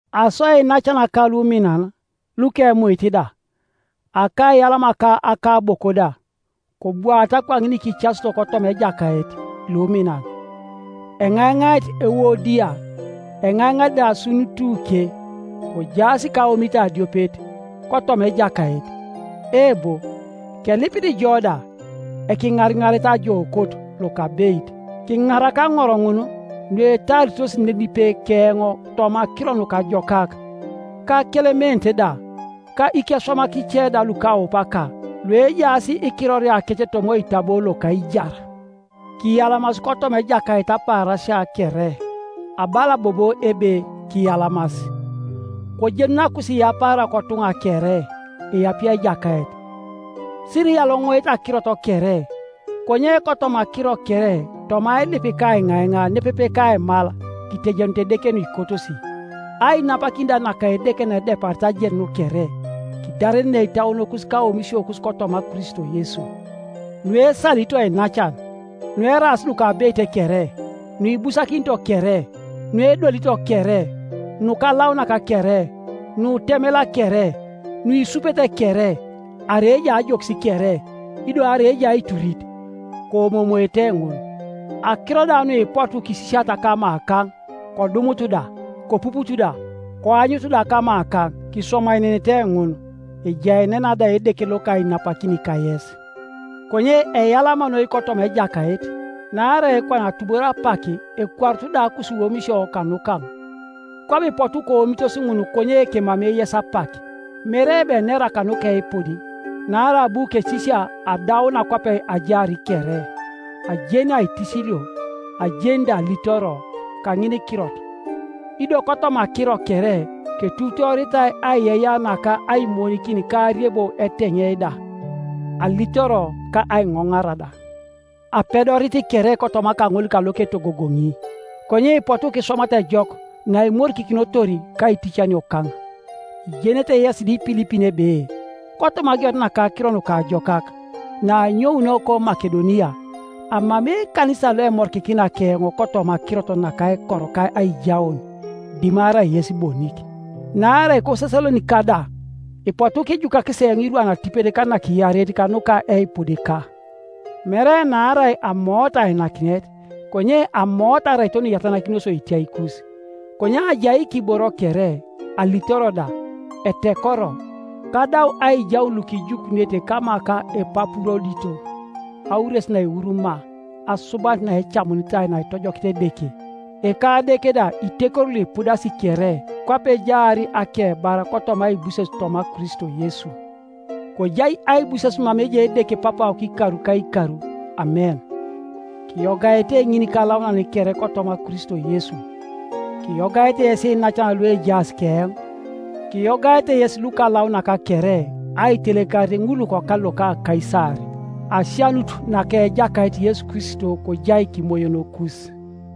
Aso iinacanaka luminan, lukemuit da, akaiyalama ka akaboko da, kobwaata kwaŋin kicasito kotoma Ejakait, luminan, Eŋaiŋait Euodia, eŋaiŋait da Suntuke, kojaas kaomit adiopet, kotoma Ejakait. Eebo, kelipit jo da, ekiŋariŋaret ajookot lokabeit, kiŋarak aŋor ŋun, nuetaaritos nenipe keoŋ toma Akiro Nukajokak, ka Kelement da, ka ikeswamak ice da lukaupaka, luejaas ikiroriakec toma oitabo loka aijar. Kiyalamas kotoma Ejakait apaarasia kere; abala bobo ebe kiyalamas. Kojenun akusiiyapaara kotuŋa kere. Eapie Ejakait. Siriyaloŋoŋoete akirot kere, konye kotoma akiro kere toma ailip ka aiŋaiŋa nepepe kaimal, kitejenut Edeke nuikotosi. Ainapakin da naka Edeke naedeparit ajenun kere, kidarenenei itauonokus ka aomisiokus kotoma Kristo Yesu. Nuesalito iinacan, nueraas nukabeit kere, nuibusakinito kere, nuedolito kere, nukalaunak kere, nutemela kere, nuisupete kere, arai ejai ajokis kere, ido arai ejai aiturit, koomoomoete ŋun. Akiro da nuipotu kisisiata kamakaŋ, kodumutu da, kopuputu da, koanyutu da kamakaŋ, kiswamaenenete ŋun; ejaenena da Edeke loka ainapakin kayes. Konye eyalama noi kotoma Ejakait, naarai kwana atubor apak ekwarutu da akusiwomisio kanukaŋ, kwabo ipotu koomitos ŋun konye kemamei yes apak. Mere ebe enera kanuka eipud; naarai abu kesisia adauna kwape ajaar kere. Ajeni aitisilio, ajeni da alitoro; kaŋinikirot, ido kotoma akiro kere, ketuutooritai aiyeiyea naka aimonikin ka ariebo eteŋei da, alitoro ka aiŋonara da. Apedorit kere kotoma kaŋol kaloketogogoni. Konye ipotu kiswamata ejok naimorikikinotor kaiticaniokaŋ. Ijenete yesi da Ipilipin ebe, kotoma ageunet naka Akiro Nukajokak, naanyounio koMakedonia, amamei ekanisa loemorikikina keoŋ kotoma akirot naka aikor ka aijaun, dimarai yes bonik, naarai koSesalonika da ipotu kijukakis eoŋ irwan atipet ka nakiareit kanuka eipudika. Mere naarai amoot ainakinet, konye amoot araito nuiyatanakinos otiaikus. Konye ajai kiboro kere, alitoro da; etekoro, kadau aijaun lukijukunete kama ka Epapurodito, aures naeuru maa, asubanit naecamunitai naitojokit Edeke. Ekadeke da itekori luipudasi kere kwape ejaar akebar kotoma aibuses toma Kristo Yesu. Kojai aibuses mama ejai Edeke Papawok ikar ka ikar. Amen. Kiyogaete ŋinikalaunan kere kotoma Kristo Yesu. Kiyogaete yes iinacan luejaas keoŋ. Kiyogaete yes lukalaunak kere, aitelekarit ŋul lukokal loka Kaisar. Asianut naka Ejakait Yesu Kristo kojai kimoyonokus.